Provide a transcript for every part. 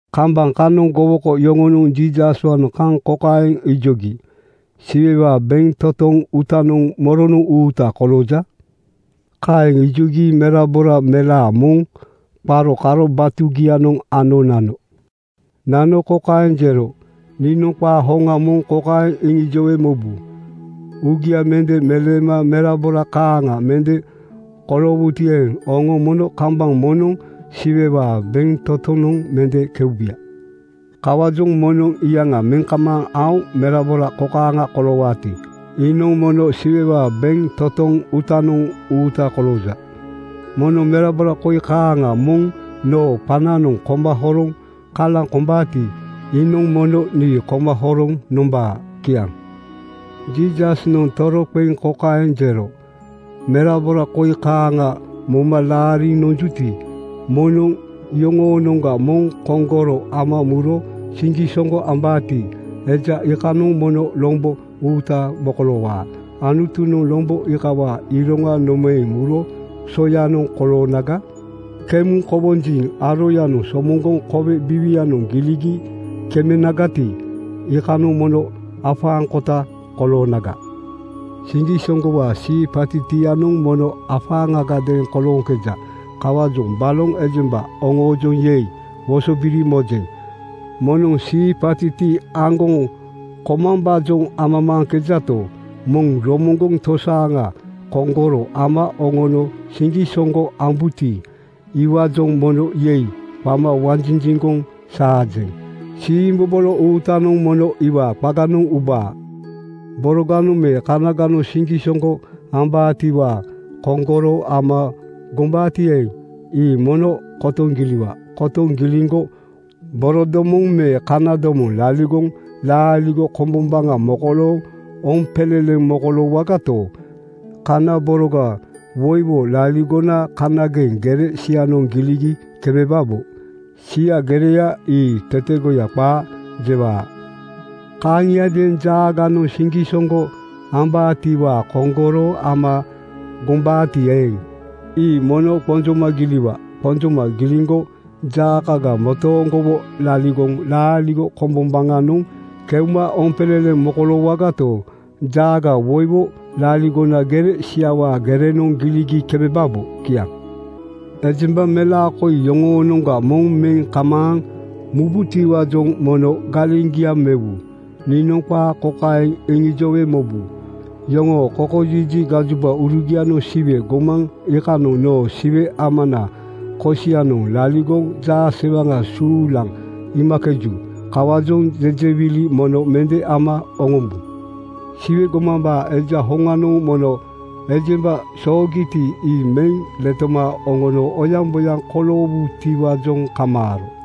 Kambaŋ kanoŋ gowoko yoŋonoŋ Jiisaswaanoŋ kaŋ kokaeŋ ijogi, “Siwewaa bentotoŋ uutanoŋ moronoŋ uuta kolooja?” Kaeŋ ijogi merabora melaa moŋ qaro karo batugianoŋ ano nano. Nano kokaeŋ jero, “Niinoŋ qaa hoŋa moŋ kokaeŋ iŋijowe mobu: Uugia mende meleema merabora kaaŋa mende koloowuti eeŋ, oŋo mono kambaŋ moŋnoŋ Siwewaa bentotonoŋ mende keubuya. “Kawaajoŋ moŋnoŋ iyaŋa meŋ kamaaŋ aoŋ merabora kokaaŋa koloowaati, iinoŋ mono Siwewaa bentotoŋ uutanoŋ uuta kolooja. Moŋnoŋ merabora koi kaaŋa moŋ noo qananoŋ koma horoŋ kalaŋ kombaati, iinoŋ mono nii koma horoŋ nombaa.” Kiaŋ. Jiisasnoŋ toroqeŋ kokaeŋ jero, “Merabora koi kaaŋa moma laariŋ nonjuti, moŋnoŋ iyoŋoonoŋga moŋ koŋgoro ama muro siŋgisoŋgo ambaati, eja iikanoŋ mono lombo uuta mokoloowaa. Anutunoŋ lombo iikawaa iroŋa nomaeŋ muro soyanoŋ koloonaga? Kemuŋ kowonjiŋ aroyanoŋ somoŋgoŋ kowe biiwianoŋ giligi kemenagati, iikanoŋ mono afaaŋkota koloonaga. “Siŋgisoŋgowaa siipatitianoŋ mono afaaŋagadeeŋ kolooŋkeja. Kawaajoŋ baloŋ ejemba oŋoojoŋ ‘Yei!’ wosobiri mojeŋ. Moŋnoŋ siipatiti aŋgoŋ komambaajoŋ amamaaŋkejato, moŋ moronoŋ tosaaŋa koŋgoro ama oŋono siŋgisoŋgo ambuti, iwaajoŋ mono ‘Yei!’ qama wanjinjiŋgoŋ saajeŋ. Siimbobolo uutanoŋ mono iwaa qaganoŋ ubaa. “Boroganoŋ me kanaganoŋ siŋgisoŋgo ambaatiwaa koŋgoro ama gombaati eeŋ, ii mono kotoŋ giliwa. Kotoŋ giliŋgo borodomoŋ me kanadomoŋ laligoŋ laaligo kombombaŋa mokolooŋ oompeleleŋ mokoloowagato, kana boroga woiwo laligona kanageŋ gere sianoŋ giligi kemebabo. Sia gereya ii tetegoya qaa jewaa. “Kaaŋiadeeŋ jaaganoŋ siŋgisoŋgo ambaatiwaa koŋgoro ama gombaati eeŋ, ii mono qonjoma giliwa. Qonjoma giliŋgo jaakoga motooŋgowo laligoŋ laaligo kombombaŋanoŋ keuma oompeleleŋ mokoloowagato, jaaga woiwo laligona gere siawaa gerenoŋ giligi kemebabo. Kiaŋ. “Ejemba melaa koi yoŋoonoŋga moŋ meŋ kamaaŋ mububotiwaajoŋ mono galeŋgia mewu. Niinoŋ qaa kokaeŋ iŋijowe mobu: Yoŋoo kokojiji gajobaurugianoŋ Siwe gomaŋ iikanoŋ noo Siwe Amanaa kosianoŋ laligoŋ jaasewaŋa suulaŋ iimakeju. Kawaajoŋ jejewili mono mende ama oŋombu. (Siwe gomambaa Eja hoŋanoŋ mono ejemba soogiti, ii meŋ letoma oŋono oyaŋboyaŋ koloowutiwaajoŋ kamaaro.)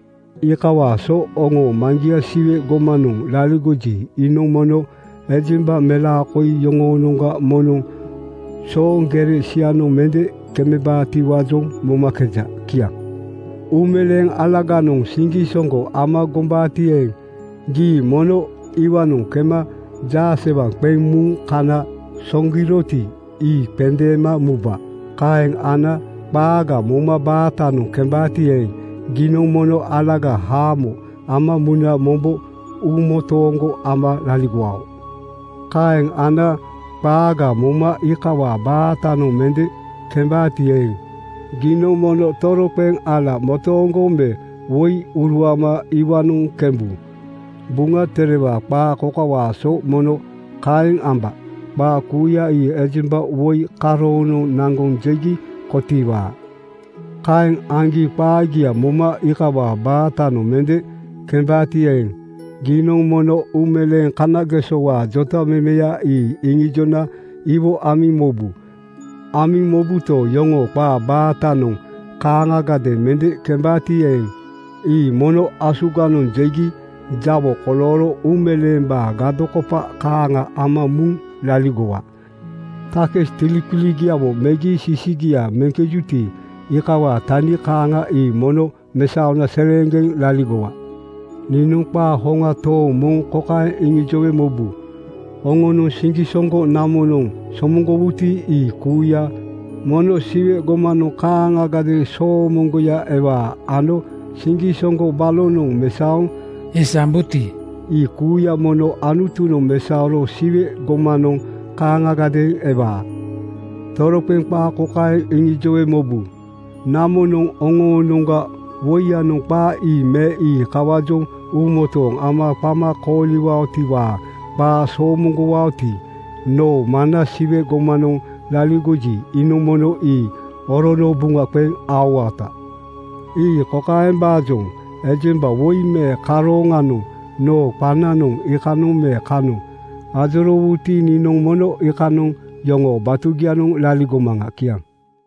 Iikawaa so oŋoo Maŋgia Siwe gomanoŋ laligoji, iinoŋ mono ejemba melaa koi yoŋoonoŋga moŋnoŋ sooŋ gere sianoŋ mende kemebaatiwaajoŋ momakeja.” Kiaŋ. “Uumeleeŋ alaganoŋ siŋgisoŋgo ama gombaati eeŋ, gii mono iwaanoŋ kema jaasewaŋ qeŋ muŋ kana soŋgiroti, ii qendeema muba. Kaeŋ ana qaaga moma baatanoŋ kembaati eeŋ, giinoŋ mono alaga haamo ama muna mombo uumotooŋgo ama laligowao. Kaeŋ ana qaaga moma iikawaa baatanoŋ mende kembaati eeŋ, giinoŋ mono toroqeŋ ala motooŋgo me woi uruama iwaanoŋ kembu. Buŋa Terewaa qaa kokawaa so mono kaeŋ amba, ‘Qaa kuuya ii ejemba woi karoonoŋ naŋgoŋ jegi kotiiwaa.’ “Kaeŋ aŋgi qaagia moma iikawaa baatanoŋ mende kembaati eeŋ, giinoŋ mono uumeleeŋ kanagesowaa jotamemeya ii iŋijona iwo amiŋ mobu. Amiŋ mobuto, iyoŋoo qaa baatanoŋ kaaŋagadeeŋ mende kembaati eeŋ, ii mono asuganoŋ jegi jawo kolooro uumeleembaa gadokopa kaaŋa ama muŋ laligowa. Takis tiliqiligiawo megi sisigia meŋkejuti, iikawaa tani kaaŋa ii mono mesaona seleeŋgeŋ laligowaa. “Niinoŋ qaa hoŋa tooŋ moŋ kokaeŋ iŋijowe mobu: Oŋonoŋ siŋgisoŋgo namonoŋ somoŋgowuti, ii kuuya mono Siwe gomanoŋ kaaŋagadeeŋ soomoŋgoya ewaa ano siŋgisoŋgo balonoŋ mesaoŋ isambuti, ii kuuya mono Anutunoŋ mesaoro Siwe gomanoŋ kaaŋagadeeŋ ewaa. “Toroqeŋ qaa kokaeŋ iŋijowe mobu: Namonoŋ oŋoonoŋga woiyanoŋ qaa ii me ii kawaajoŋ uumotooŋ ama qama kooliwaotiwaa qaa somoŋgowaoti, noo Maŋna Siwe gomanoŋ laligoji, iinoŋ mono ii orono buŋa qeŋ aowaota. Ii kokaembaajoŋ: Ejemba woi me karoonoŋ noo qananoŋ iikanoŋ me kanoŋ ajoroowuti, niinoŋ mono iikanoŋ yoŋoo batugianoŋ laligomaŋa.” Kiaŋ.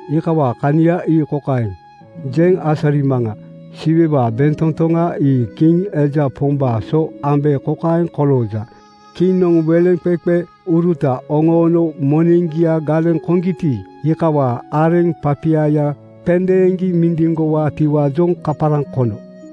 Iikawaa kania ii kokaeŋ jeŋ asarimaŋa. Siwewaa bentotoŋa ii kiŋ eja pombaa so ambe kokaeŋ kolooja: Kiŋnoŋ weleŋqeqeuruta oŋoono moneŋgia galeŋ koŋgiti, iikawaa areŋ papiaya qendeeŋgi mindiŋgowaatiwaajoŋ kaparaŋ kono.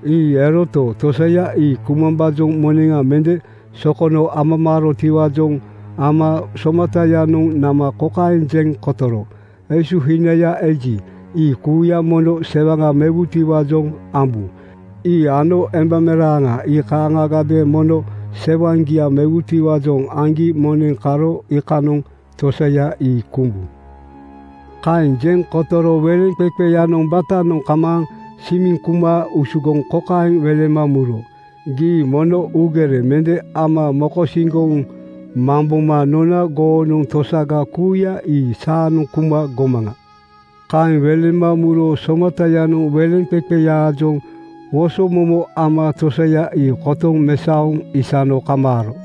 Ii eroto, tosaya ii kumambaajoŋ moneŋa mende sokono amamaarotiwaajoŋ ama somatayanoŋ nama kokaeŋ jeŋ kotoro, ‘Esuhinaya eji, ii kuuya mono sewaŋa mewutiwaajoŋ ambu. Ii ano embameraaŋa ii kaaŋagadeeŋ mono sewaŋgia mewutiwaajoŋ aŋgi moneŋ karo iikanoŋ tosaya ii kumbu. “Kaeŋ jeŋ kotoro weleŋqeqeyanoŋ batanoŋ kamaaŋ simiŋ kuma usugoŋ kokaeŋ welema muro, ‘Gii mono uugere mende ama mokosiŋgoŋ mamboma nona goonoŋ tosaga kuuya ii saanoŋ kuma gomaŋa.’ Kaeŋ welema muro somatayanoŋ weleŋqeqeyaajoŋ wosomomo ama tosaya ii kotoŋ mesaoŋ isano kamaaro.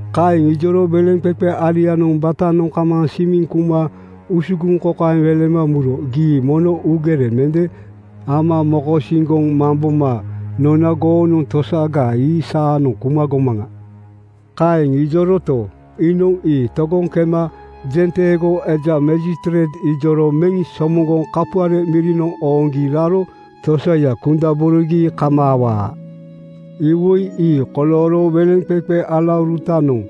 “Kaeŋ ijoro weleŋqeqe alianoŋ batanoŋ kamaaŋ simiŋ kuma usugoŋ kokaeŋ welema muro, ‘Gii mono uugere mende ama mokosiŋgoŋ mamboma nona goonoŋ tosaga ii saanoŋ kuma gomaŋa.’ “Kaeŋ ijoroto, iinoŋ ii togoŋ kema jenteego eja majistreit ijoro meŋ somoŋgoŋ kapuare mirinoŋ ooŋgi raro tosaya kundaborogi kamaawaa. Iwoi ii kolooro weleŋqeqe alaurutanoŋ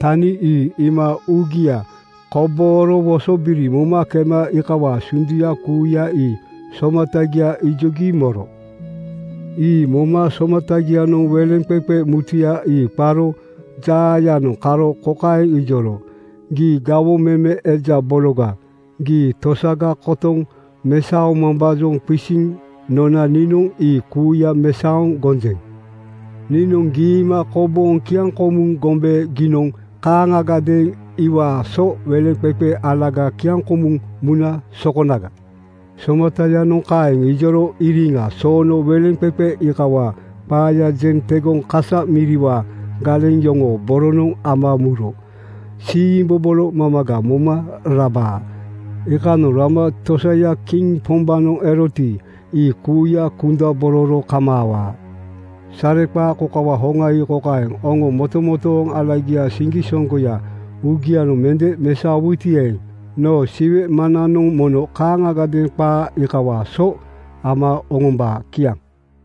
tani ii iima uugia kobooro wosobiri moma kema iikawaa sunduya kuuya ii somatagia ijogi moro. “Ii moma somatagianoŋ weleŋqeqe mutuya ii qaro jaayanoŋ karo kokaeŋ ijoro, ‘Gii gawoŋ meme eja bologa! Gii tosaga kotoŋ mesaomambaajoŋ qisiŋ nona niinoŋ ii kuuya mesaoŋ gonjeŋ. Niinoŋ giima kobooŋ kiaŋkomuŋ gombe giinoŋ kaaŋagadeeŋ iikawaa so weleŋqeqe alaga kiaŋkomuŋ muna sokonaga.’ “Somatayanoŋ kaeŋ ijoro iriŋa soono weleŋqeqe iikawaa qaaya jeŋ tegoŋ kasa miriwaa galeŋ yoŋoo boronoŋ ama muro siimbobolo mamaga moma rabaa. Iikanoŋ rama tosaya kiŋ pombaanoŋ eroti, ii kuuya kundabororo kamaawaa. Sareqaa kokawaa hoŋa ii kokaeŋ: Oŋo motomotooŋ alagiaa siŋgisoŋgoya uugianoŋ mende mesaowuti eeŋ, noo Siwe Maŋnanoŋ mono kaaŋagadeeŋ qaa iikawaa so ama oŋombaa.” Kiaŋ.